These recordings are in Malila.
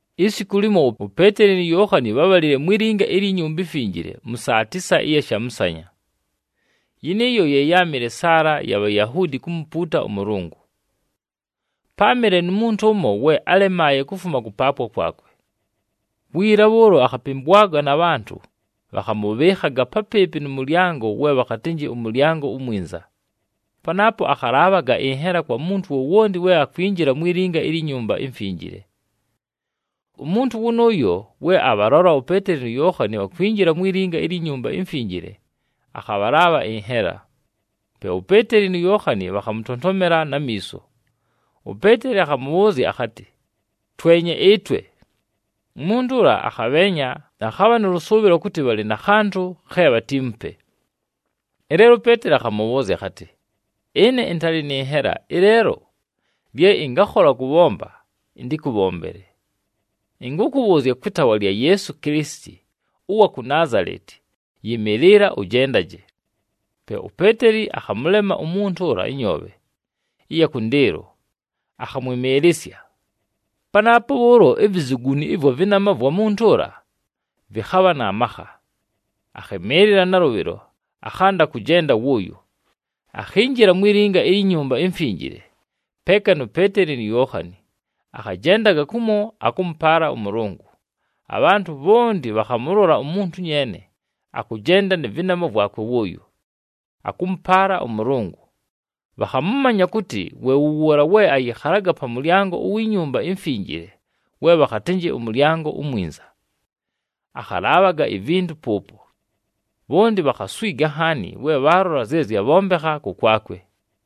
Isiku limo, uPeeteli nu Yookhani bhábhalile mwi linga ilyi Nyumba iMfinjile mʉ saa tisa ɨya shamʉsanya, yɨnɨɨyo ye yáamɨle saala ya Bhayahuudi kumupuuta ʉMʉlʉngʉ. Páamɨle nu muntu ʉmo we álemaaye kufuma kʉpaapwa kwakwe. Wiila bhʉʉlo akhapɨmbwaga na bhantʉ, bhakhamʉbhɨɨkhaga papɨɨpɨ nʉ mʉlyango we bhakhatɨnjɨ ʉMʉlyango uMwinza. Panaapo akhalaabhaga ɨnhela kwa muntu wowonti we akwinjila mwi linga ilyi Nyumba iMfinjile. Umuntu wʉnʉʉyo, we abhalola uPeeteli nu Yookhani bhakwinjila mwi linga ilyi Nyumba iMfinjile, akhabhalaabha ɨnhela. Pe uPeeteli nu Yookhani bhakhamʉtontomela na miiso. UPeeteli akhamʉbhʉʉzya akhatɨ, “Twenye ɨtwe!” Umuntu ʉla akhabheenya, akhabha nʉ lʉsʉʉbhɨlo kʉtɨ bhalɨ na khantʉ khe bhatiimupe. Ɨleelo uPeeteli akhamʉbhʉʉzya akhatɨ, “Ɨne ɨntalɨ nɨ nhela, ɨleelo lye ɨngakhola kʉbhomba, ɨntɨkʉbhombele. Ɨnkʉkʉbhʉʉzya kwɨ taawa lya Yeesu Kilisiti ʉwa ku Naazaleti, yɨmɨɨlɨla ʉjendaje!” Pe uPeeteli akhamʉlema umuntu ʉla ɨnyoobhe ɨya kʉndɨɨlo, akhamwɨmɨɨlɨsya. Panaapo bhʉʉlo ivizuguni ɨvwa vɨnama vwa muntu ʉla vɨkhabha na makha. Akhɨmɨɨlɨla nalʉbhɨlo, akhanda kʉjenda wʉʉyo. Akhinjila mwi linga ilyi Nyumba iMfinjile peeka nu Peeteli nu Yookhani, akhajendaga kumo akʉmʉpaala ʉMʉlʉngʉ. Abhantʉ bhonti bhakhamʉlola umuntu nyeene akʉjenda nɨ vɨnama vwakwe wʉʉyo, akʉmʉpaala ʉMʉlʉngʉ. Bhakhamʉmanya kʉtɨ we wʉ wʉʉla we ayɨkhalaga pa mʉlyango uwi Nyumba iMfinjile we bhakhatɨnjɨ ʉMʉlyango uMwinza, akhalaabhaga ivintu pʉʉpo. Bhonti bhakhaswiga nhaani we bhaalola zye zyabhombekha kʉkwakwe.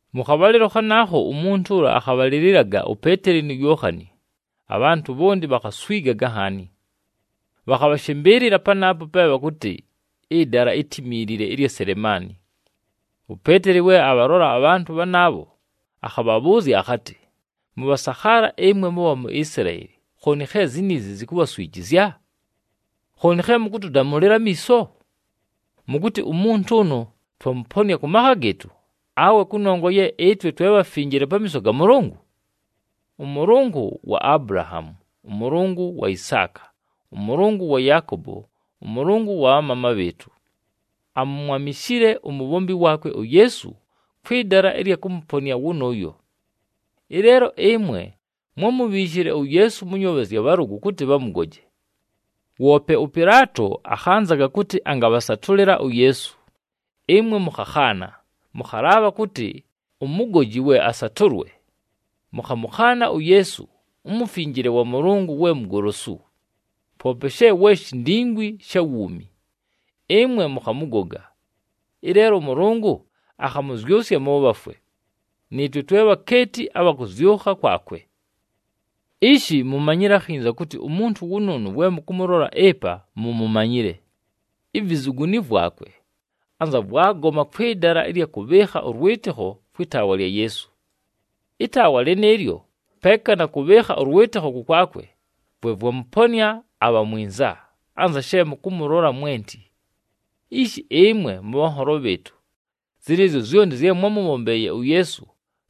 Mʉ khabhalɨlo khanaakho, umuntu ʉla akhabhalɨlɨlaga uPeeteli nu Yookhani. Abhantʉ bhonti bhakhaswigaga nhaani, bhakhabhashɨmbɨɨlɨla panaapo pe bhakʉtɨ ɨdala itimiilile ɨlya Selemaani. UPeeteli we abhalola abhantʉ bhanaabho, akhabhabhʉʉzya akhatɨ, “Mʉbhasakhaala ɨmwe mʉbha mu Isilaeli, khooni khe ziniizi zikubhaswijizya? Khooni khe mʉkʉtʉdamʉlɨla amiiso? Mʉkʉtɨ umuntu ʉnʉ twamʉponɨa kʉ makha gɨɨtʉ, awe kʉnongwa ye ɨtwe twe bhafinjile pamiiso ga Mʉlʉngʉ? ɄMʉlʉngʉ wa Abulahaamu, ʉMʉlʉngʉ wa Isaaka, ʉMʉlʉngʉ wa Yaakobo, ʉMʉlʉngʉ wa bhamaama bhɨɨtʉ, amumwamishile umubhombi waakwe uYeesu kwɨ dala ɨlya kʉmʉponɨa wʉnʉʉyo. Ɨleelo ɨmwe mwámubhiishile uYeesu mʉ nyoobhe zya bhalʉgʉ kʉtɨ bhamʉgoje. Woope ʉPɨlaato akhanzaga kʉtɨ angabhasatʉlɨla uYeesu, ɨmwe mʉkhakhaana, mʉkhalaabha kʉtɨ umugoji we asatʉlwe! Mʉkhamʉkhaana uYeesu, uMufinjile wa Mʉlʉngʉ we Mugolosu. Poope she we shindingwi sha wuumi, ɨmwe mʉkhamʉgoga. Ɨleelo ʉMʉlʉngʉ akhamʉzyʉsya mʉ bhafwe, nɨɨtwe twe bhakeeti abha kʉzyʉkha kwakwe. “Ishi mumanyile akhinza kʉtɨ umuntu wʉnʉʉnʉ we mʉkʉmʉlola ɨpa mumumanyile, ivizuguni vwakwe anza vwagoma kwɨ dala ɨlya kʉbhɨɨkha ʉlwɨtɨkho kwɨ taawa lya Yeesu. Ɨtaawa lɨnɨɨlyo, peeka na kʉbhɨɨkha ʉlwɨtɨkho kʉkwakwe, vwe vwamʉponɨa abha mwinza, anza she mʉkʉmʉlola mwenti. Ishi ɨmwe mʉbhanholo bhɨɨtʉ, zɨnɨɨzyo zyonti zye mwámʉbhombeeye uYeesu,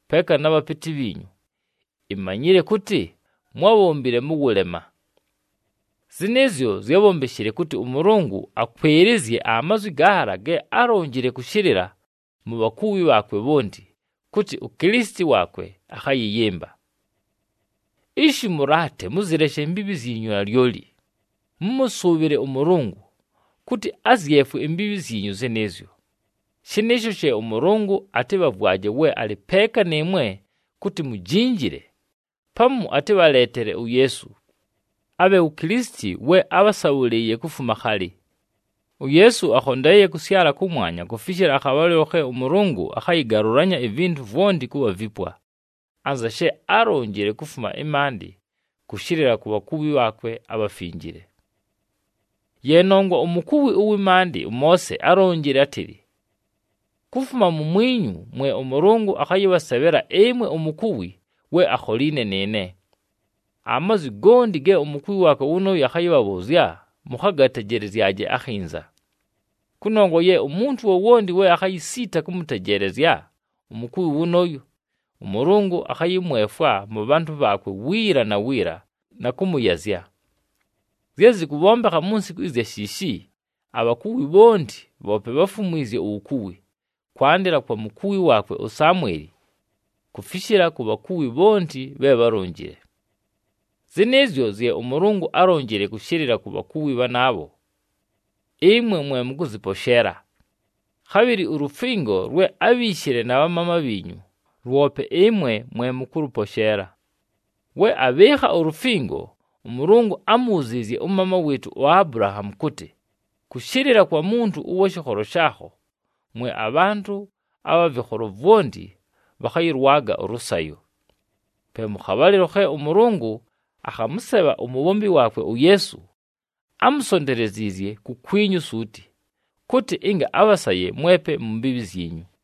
peeka na bhapɨtɨ bhiinyu, imanyile kʉtɨ mwábhombile mʉ wʉlema. Zɨnɨɨzyo zyábhombeshile kʉtɨ ʉMʉlʉngʉ akwɨlɨzye amazwi gaala ge álonjile kʉshɨlɨla mu bhakuwi bhaakwe bhonti, kʉtɨ uKilisiti waakwe akhayɨyɨmba. “Ishi mʉlaate, mʉzɨleshe imbiibhi zyinyu nalyoli, mʉmʉsʉʉbhɨle ʉMʉlʉngʉ, kʉtɨ azyefwe imbiibhi zyinyu zɨnɨɨzyo. Shɨnɨɨsho she ʉMʉlʉngʉ atɨbhavwaje we alɨ peeka nɨɨmwe kʉtɨ mujinjile, pamu atɨbhaleetele uYeesu, abhe wu Kilisiti we ábhasabhʉlɨɨye kufuma khalɨ. UYeesu akhondeeye kʉsyala kʉmwanya kufishila akhabhalɨlo khe ʉMʉlʉngʉ akhayɨgalʉlanya ivintu vwonti kʉbha vipwa, anza she álonjile kufuma ɨmaandɨ kʉshɨlɨla ku bhakuwi bhaakwe abhafinjile. “Ye nongwa umukuwi ʉwɨ maandɨ ʉMoose álonjile átɨlɨ, ‘Kufuma mumwinyu mwe ʉMʉlʉngʉ akhayɨbhasebhela ɨmwe umukuwi we akholiine nɨɨne. Amazwi gonti ge umukuwi waakwe wʉnʉʉyo akhayɨbhabhʉʉzya, mʉkhagatejelezyaje akhinza. Kʉnongwa ye umuntu wowonti we akhayisiita kʉmʉtejeelezya umukuwi wʉnʉʉyo, ʉMʉlʉngʉ akhayɨmwefwa mʉ bhantʉ bhaakwe wiila na wiila, na kʉmʉyazya.’ Zye zɨkʉbhombekha mu nsiku ɨzya shiishi, abhakuwi bhonti bhoope bháfumwizye uwukuwi, kwandɨla kwa mukuwi waakwe uSamweli, kufishila ku bhakuwi bhonti bhe bhálonjile. Zɨnɨɨzyo zye ʉMʉlʉngʉ álonjile kʉshɨlɨla ku bhakuwi bhanaabho, ɨmwe mwe mʉkʉzɨposheela. Khabhɨlɨ ulufingo lwe ábhiishile na bhamaama bhiinyu, lwope ɨmwe mwe mʉkʉlʉposheela. We abhɨɨkha ulufingo, ʉMʉlʉngʉ ámubhuziizye ʉmaama wɨɨtʉ uAbulahaamu kʉtɨ, ‘Kʉshɨlɨla kwa muntu ʉwa shɨkholo shaakho, mwe abhantʉ abha vɨkholo vwonti bhakhayɨlwaga ʉlʉsayo.’ Pe mʉ khabhalɨlo khe ʉMʉlʉngʉ akhamʉsebha umubhombi waakwe uYeesu, ámusonteleziizye kukwinyu suuti, kʉtɨ ɨnga abhasaye mwepe mu mbiibhi zyinyu.”